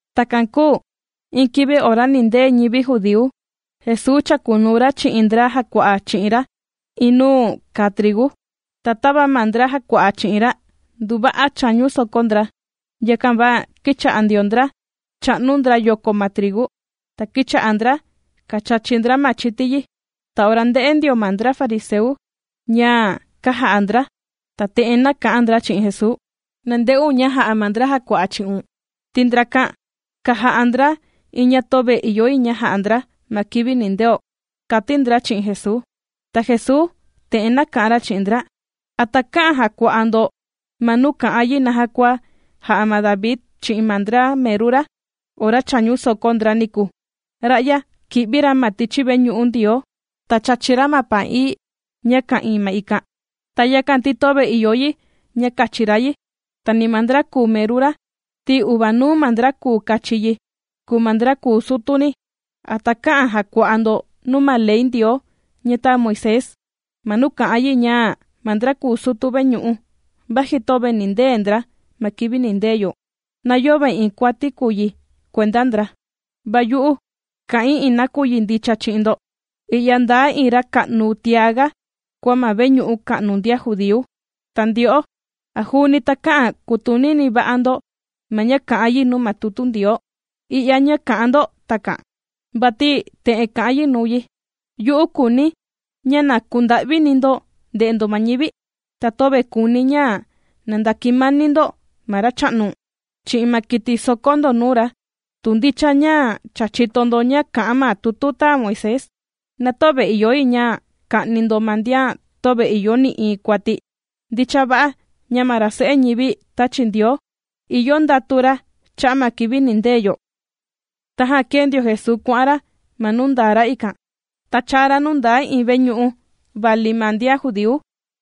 Takan kūu iin kivi ora nindee ñivi judíu, Jesuu chàkunuu ra chi'in ndra jàkua'a chi'in ra iin nuu kàa trigu. Ta tava ma ndra jàkua'a chi'in ra nduva'a chāñu soko ndra, yakan va kīcha'a ndio ndra chà'nu ndra yoko ma trigu, ta kīcha'a ndra kàchachi ndra ma chiti yi. Ta ora ndē'e ndio ma ndra fariseu ña kàja'a ndra, ta te'en nāka'an ndra chi'in Jesuu: ―Na nde'un ña ja'a ma ndra jàkua'a chi'un, ti ndrakan kàja'a ndra iin ña töve ìyo yi ña ja'a ndra ma kivi nindeo ―kàti ndra chi'in Jesuu. Ta Jesuu te'en nāka'an ra chi'in ndra: ―¿A takä'an jàkua'a ndo ma nuu kà'an yi naja kua jā'a ma David chi'in ma ndra meru ra ora chāñu soko ndra niku? Ra'ya kī'vi ra ma tichi veñu'u Ndioo, ta chāchi ra ma paan ií ña ka'ìin ma ikan. Ta yakan ti töve ìyo yi ña kachi ra yi, ta ni ma ndra kùu meru ra, ti uvanuu ma ndra kùu kachi yi, kùu ma ndra kùu sutu ni. ¿A takä'an jakua'a ndo nuu ma Ley Ndioo ña tāa Moisés, ma nuu kà'an yi ña ma ndra kùu sutu veñu'u, vaji töve nindee ndra ma kivi nindee yo, na yöve iin kuati kùu yi kuenda ndra? Va yu'u kà'in iin nakuyi ña ndicha chi'in ndo, i'ya ndaa iin ra ka'nu tiaga kua ma veñu'u ka'nu ndian judíu. Ta ndyo'o, ¿a juuni takä'an kutunini va'a ndo ma ña kà'an yi nuu ma tutu Ndioo i'ya ña kà'an ndo takan? Vati te'en kà'an yi nuu yi: “Yu'u kùuni̱ ña na kunda'vini ndo nde'e ndo ma ñivi, ta töve kùuni̱ ña ndakimani ndo ma Racha'nu chi'in ma kiti sòkó ndo nuu ra.” Tu ndicha ña cha chìto ndo ña kà'an ma tutu tāa Moisés, na töve ìyo yi ña ka'ni ndo ma ndian töve ìyo nï'iin kuati. Ndicha va'a ña ma ra Se'e ñivi tāchi Ndioo, ìyo ndatu ra cha'a' ma kivi nindee yo. Tajan kēe ndio Jesuu kuà'an ra ma nuu ndaa ra ikan, ta chāa ra nuu ndaa iin veñu'u vali ma ndian judíu,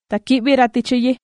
ta kī'vi ra tichi yi.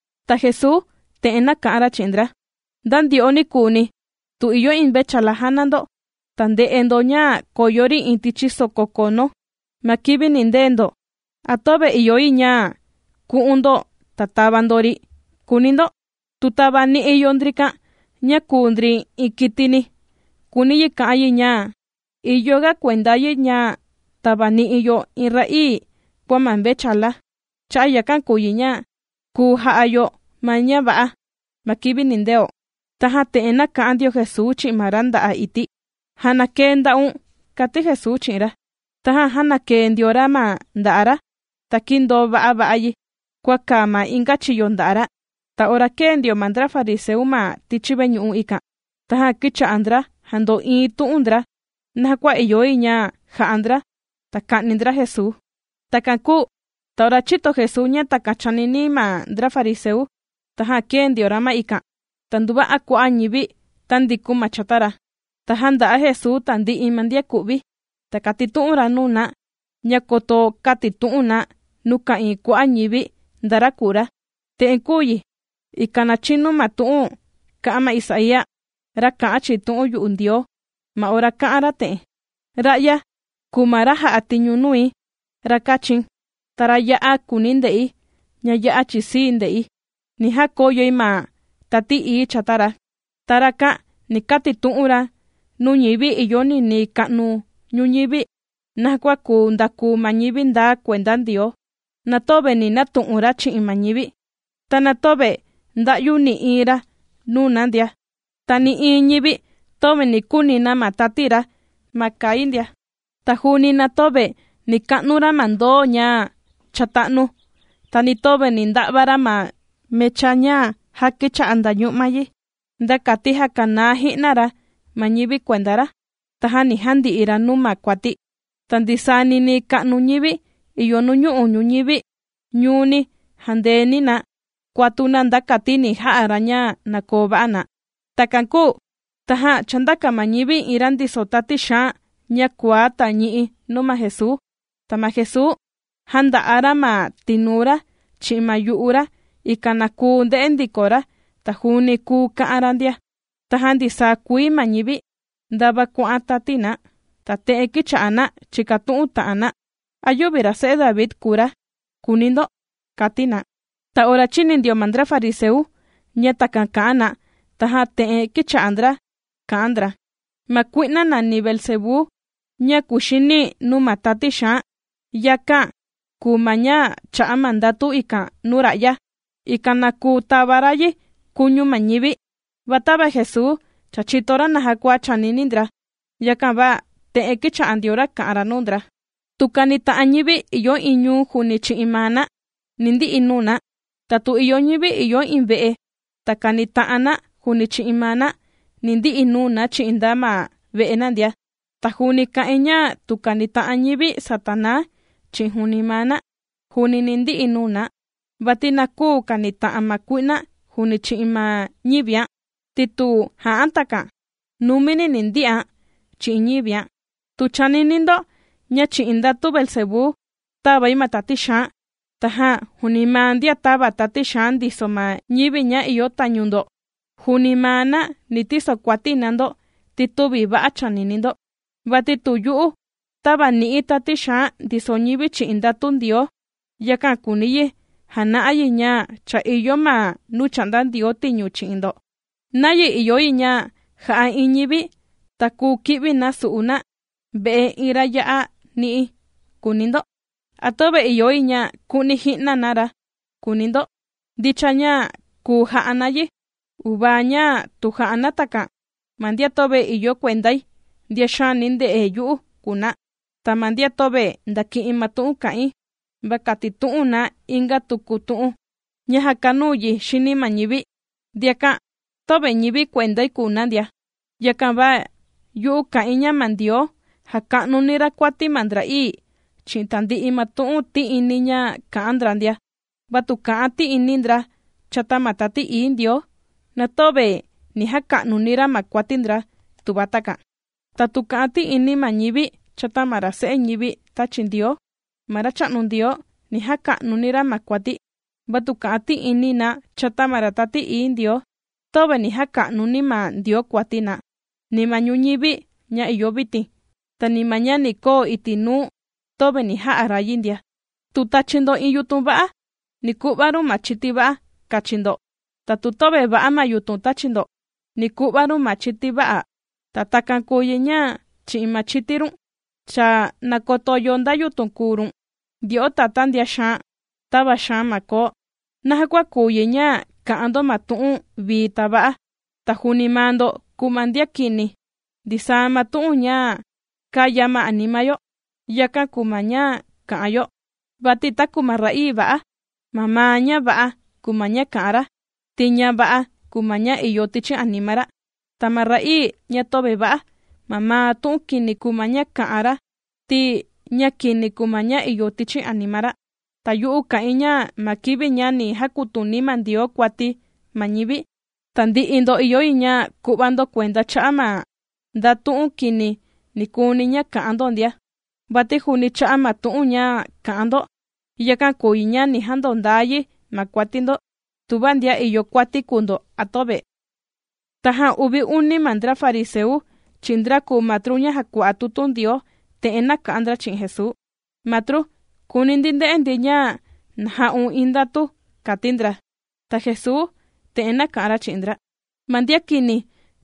Ta Jesuu te'en nāka'an ra chi'in ndra: ―¿Nda ndyo'o nikuuni, tu ìyo iin mvechala jàna ndo, ta nde'e ndo ña koyo ri iin tichi soko kono, ma kivi nìndee ndo, a töve ìyo yi ña ku'un ndo, ta tava ndo ri?, kùuni ndo. Tu tavani'i yo ndrikan ña kùu ndri iin kitini, kùuni yi ka'an yi ña, ¡ìyo ga kuenda yi ña tavani'i yo iin ra'ii kua ma mvechala! Cha'a' yakan kùu yi ña, kùu ja'a yo ma ña va'a ma kivi nindeo. Tajan te'en nāka'an ndio Jesuu chi'in ma ra nda'a' ití: ―Jànakee nda'un ―kàti Jesuu chi'in ra. Tajan jānakee ndio ra ma nda'a' ra, ta kīndoo va'a va'a yi, kua kàa ma inga chiyo nda'a' ra. Ta ora kēe ndio ma ndra fariseu ma tichi veñu'u ikan, tajan kīcha'a ndra jando'iin tu'un ndra, naja kua ìyo yi ña jà'a ndra, ta ka'ni ndra Jesuu. Takan kūu ta ora chīto Jesuu ña takan chànini ma ndra fariseu, tajan kēe ndio ra ma ikan, ta nduva'a kua'a' ñivi tāndikun na chata ra. Ta jànda'a Jesuu tandi'i ma ndian ku'vi, ta kàtitu'un ra nuu na ña koto kätitu'un na nuu ka'ìin kua'a' ñivi nda ra kùu ra. Te'en kūu yi, ikan na chinu ma tu'un kā'an ma Isaía, ra kā'an chi'in tu'un yu'u Ndioo, ma ora kā'an ra te'en: Ra'ya kùu ma ra jà'a tiñu nui, ra kāchi̱n, ta ra ya'a kùuni̱ nde'i, ña ya'a chisii̱ nde'i. Ni jakoyoi ma Tati Ií chata ra. Ta rakan ni katitu'un ra nuu ñivi ìyo ninii ka'nu ñuñivi naja kua kuu ndakuu na ñivi ndaa kuenda Ndioo. Na töve ni natu'un ra chi'in ma ñivi, ta na töve nda'yu ni'i ra nuu na ndia, ta ni nï'iin ñivi töve ni kuni na ma tati ra ma kai ndia. Ta juuni na töve ni ka'nu ra ma ndoo ña cha tā'nu, ta ni töve ni nda'va ra ma mecha ña ja kicha'a ndañu'ma yi, nda kati jakanaa ji'na ra ma ñivi kuenda ra, tajan ni jandi'i ra nuu ma kuati. Ta ninii ka'nu ma nuñu'u' ñuñivi ni jandeeni na kuatu na, nda kati ni ja'a ra ña na koo va'a na. Takan kūu tajan chāndaka ma ñivi iin ra ndiso tati xaan ña kuaá ta ñi'i nuu ma Jesuu. Ta ma Jesuu jānda'a ra ma tinuu ra chi'in ma yu'u ra, ikan na kuu ndè'e ndiko ra ta juuni kùu ka'an ra ndia. Tajan ndisaa kuii ma ñivi, ndava kuà'an tati na, ta te'en kīcha'a na chìkatu'un ta'an na: ―¿A yüvi ra se'e David kùu ra'ya?, kùuni ndo ―kàti na. Ta ora chīni ndio ma ndra fariseu ña takan kà'an na, tajan te'en kīcha'a ndra kà'an ndra: ―Ma kui'na nàni Beelzebú ña kuxini nuu ma tati xaan, yakán' kùu ma ña chā'a ma ndatu ikan nuu ra'ya, ikan na kuu tava ra yi kuñu ma ñivi ―kà'an ndra. Va tava Jesuu cha chìto ra naja kua chànini ndra, yakan va te'en kīcha'a ndio ra kà'an ra nuu ndra: ―Tu kànita'an ñivi ìyo iin ñuu juuni chi'in maa na, ni ndi'i nuu na. Ta tu ìyo ñivi ìyo iin ve'eni ta kanita'an na juuni chi'in maa na, ni ndi'i nuu na chi'in nda ma ve'e na ndia. Ta juuni kà'in ña tu kànita'an ñivi Satanaa chi'in juuni maa na, juuni ni ndi'i nuu na, vati na küu kanita'an ma kui'na juuni chi'in ma ñivián'. Ti tu ja'án' takan, numini ni ndi'án' chi'in ñivián'. Tu chànini ndo, ña chi'in ndatu Beelzebú tàvai ma tati xaan, tajan juuni ma ndian tàva tati xaan ndiso ma ñivi ña ìyo tañu ndo, juuni maa na ni tisokuati na ndo, ti tüvi va'a chànini ndo. Vati tu yu'u tàvani'i̱ tati xaan ndiso ñivi chi'in ndatu Ndioo, yakan kùuni yi jana'a yi ña cha ìyo ma nuu chà'nda Ndioo tiñu chi'in ndo. ¿Nayi ìyo yi ña ja'a iin ñivi, ta kùu ki'vi na su'u na ve'e iin ra ya'a ni'i?, kùuni ndo. ¿A töve ìyo yi ña ku'ni ji'na na ra?, kùuni ndo. Ndicha ña kùu ja'a na yi, uvaa ña tu jà'a na takan. ’Ma ndian töve ìyo kuendai, ndian xaani nde'e yu'u kùu na. Ta ma ndian töve ndàki'in ma tu'un kà'in, va kàtitu'un na inga tuku tu'un ña jàkanuu yi xini ma ñivi, ndiakan töve ñivi kuendai kùu na ndia. ’Yakan va yu'u kà'in ña ma Ndioo, jàka'nuni ra kuati ma ndra'ii, chi'in tandi'i ma tu'un ti'ini ña kà'an ndra ndia. Va tu kà'an ti'ini ndra chata ma Tati Ií Ndioo, na töve ni jaka'nuni ra ma kuati ndra tuva takan. Ta tu kà'an ti'ini ma ñivi chata ma ra Se'e ñivi tāchi Ndioo, ma Racha'nu Ndioo ni jaka'nuni ra ma kuati. Va tu kà'an ti'ini na chata ma Ra Tati Ií Ndioo, töve ni jaka'nuni ma Ndioo kuati na, ni ma ñuñivi ña ìyo vitin, ta ni ma ña ni koo iti' nuu töve ni ja'a ra yi ndia. ’Tu tachi ndo iin yutun va'a, ni ku'va run ma chiti va'a kachi ndo. Ta tu töve va'a ma yutun tàchi ndo, ni ku'va run ma chiti vä'a'. Ta takan kùu yi ña chi'in ma chiti run, cha nakoto yo nda yutun kùu run. ¡Ndyo'o tatá ndian xaan tava xaan ma koo! ¿Naja kua kùu yi ña kà'an ndo ma tu'un vii ta va'a, ta juuni maa ndo kùu ma ndian kini? Ndisaa ma tu'un ña kàya ma anima yo, yakan kùu ma ña kà'an yo. Vati taku ma ra'ii va'a, mamaa ña va'a kùu ma ña kà'an ra, ti ña va'a kùu ma ña ìyo tichi anima ra. Ta ma ra'ii ña töve va'a, mamaa tu'un kini kùu ma ña kà'an ra, ti ña kini kùu ma ña ìyo tichi anima ra. Ta yu'u kà'in ña ma kivi ña ni jakutuni ma Ndioo kuati ma ñivi, tandi'i ndo ìyo yi ña ku'va ndo kuenda cha'a' ma nda tu'un kini nikuuni ña kā'an ndo ndia. Vati juuni cha'a ma tu'un ña kà'an ndo, yakan kùu yi ña ni jandondaa yi ma kuati ndo, tuva ndian ìyo kuati kùu ndo a töve. Tajan uvi uni ndra fariseu, chi'in ndra kùu matru ña jàkua'a tutu Ndioo, te'en nāka'an ndra chi'in Jesuu: ―Matru, kùuni ndi nde'e ndi ña na ja'un iin ndatu ―kàti ndra. Ta Jesuu te'en nāka'an ra chi'in ndra: ―Ma ndian kini,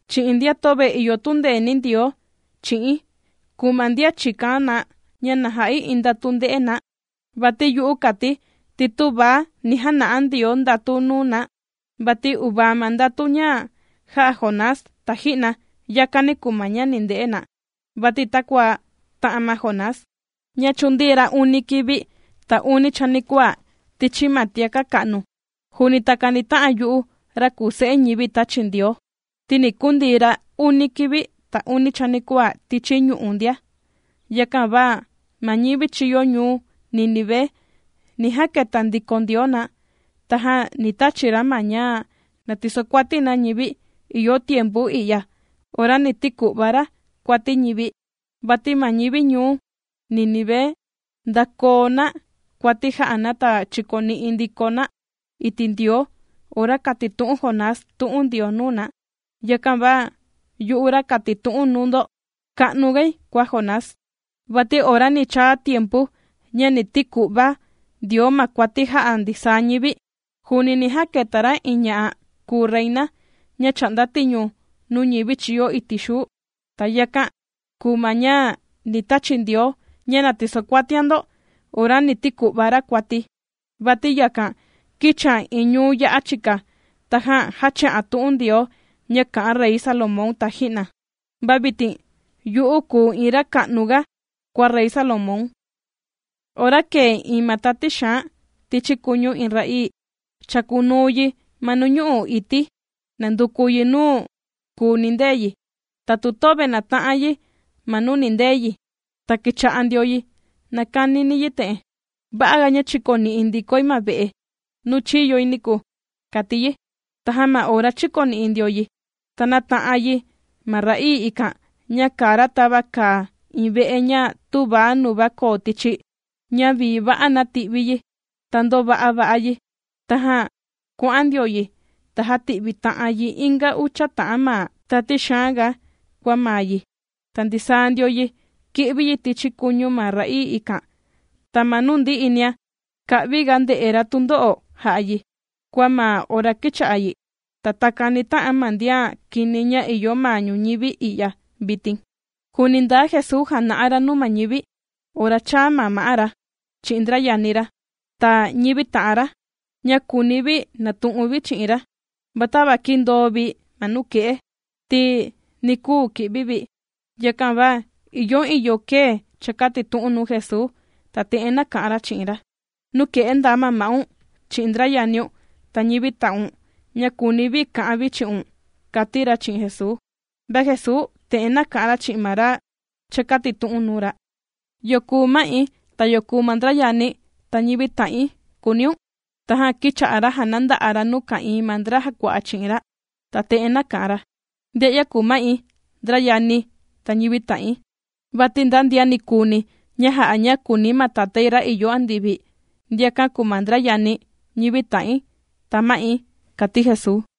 chi'in ndian töve ìyo tundeeni Ndioo chi'in kùu ma ndian chìkan na ña na ja'i iin ndatu ndē'e na. Va yu'u kàti̱ ti tüva ga ni jana'a Ndioo ndatu nuu na, vati uvaa ma ndatu ña jā'a Jonás taji'na. Yakani kùu ma ña ni nde'e na. Vati takua tā'an ma Jonás ña chūndii ra uni kivi, ta uni chanikuaa tichi ma tiaka' ka'nu, juuni takan ni ta'an yu'u ra kùu Se'e ñivi tāchi Ndioo, ti ni kundii ra uni kivi, ta uni chanikuaa tichi ñu'u' ndia. Yakan va ma ñivi chīyo ñuu Nínive ni jaketa ndiko Ndioo na, tajan ni tachi ra na ña na tisokuati na ñivi ìyo tiempu i'ya ora ni tiku'va ra kuati ñivi. Vati ma ñivi ñuu Nínive ndākoo na kuati jā'a na ta chīkoni'i ndiko na iti' Ndioo ora kātitu'un Jonás tu'un Ndioo nuu na. Yakan va yu'u ra kàtitu'un nuu ndo ka'nugai kua Jonás. Vati ora ni chaa tiempu ña ni tiku'va Ndioo ma kuati jà'a ndisaa ñivi, juuni ni jaketa ra iin ña'a kūu reina ña chà'nda tiñu nuu ñivi chīyo iti' xuu. Ta yakan kùu ma ña ni tachi Ndioo ña na tisokuatian ndo ora ni tiku'va ra kuati. Vati yakan kīchian iin ñuu ya'a chika, tajan jāchi'an tu'un Ndioo ña kā'an Rey Salomón taji'na. Va vitin yu'u kùu iin ra ka'nu ga kua Rey Salomón. ’Ora kèe iin ma tati xaan tichi kuñu iin ra'ii, chàkunuu yi ma nuñu'u' ití nànduku yi nuu kùu nindee yi. Ta tu töve nàta'an yi ma nuu nindee yi, ta kīcha'a ndio yi nàkanini yi te'en: “Va'a ga ña chikoni'i ndikoi ma ve'e nuu chīyoi niku”, kàti yi. Tajan ma ora chīkoni'i ndio yi, ta nàta'an yi ma ra'ii ikan ña kàa ra tava kàa iin ve'e ña tüva ña koo tichi, ña vii va'a nāti'vi yi, ta ndōva'a va'a yi. Tajan kuà'an ndio yi, ta jàti'vi ta'an yi inga ucha ta'an ma tati xaan ga kua maa yi, ta ndisaa ndio yi kì'vi yi tichi kuñu ma ra'ii ikan, ta ma nuu ndi'i nia ka'vi ga ndè'e ra tundo'o jà'a yi, kua ma ora kīcha'a yi. Ta takan ni ta'an ma ndian kini ña ìyo ma ñuñivi i'ya vitin. Juuni ndaa Jesuu jàna'a ra nuu ma ñivi, ora chāa ma ma'á ra, chi'in ndra yani ra, ta ñivi ta'an ra, ña kùuni vi natu'un vi chi'in ra. Va tava kīndoo vi ma nuke'e, ti nī kuu ki'vi vi. Yakan va ìyo iin yo kēe chākatitu'un nuu Jesuu, ta te'en nāka'an ra chi'in ra: ―Nuke'e ndaa ma'un, chi'in ndra yaniun, ta ñivi ta'un, ña kùuni vi ka'an vi chi'un ―kàti ra chi'in Jesuu. Va Jesuu te'en nāka'an ra chi'in ma ra chākatitu'un nuu ra: ―¿Yo kùu ma'i, ta yo kùu ma ndra yani̱, ta ñivi ta'in?, kùuniun. Tajan kīcha'a ra jànanda'a ra nuu ka'ìin ma ndra jàkua'a chi'in ra, ta te'en nāka'an ra: ―Ndia'ya kùu ma'i, ndra yani̱, ta ñivi ta'in. Vati nda ndian nikuuni ña jà'a ña kùuni ma Tatái ra ìyo andivi, ndiakan kùu ma ndra yani̱, ñivi ta'in, ta ma'i ―kàti Jesuu.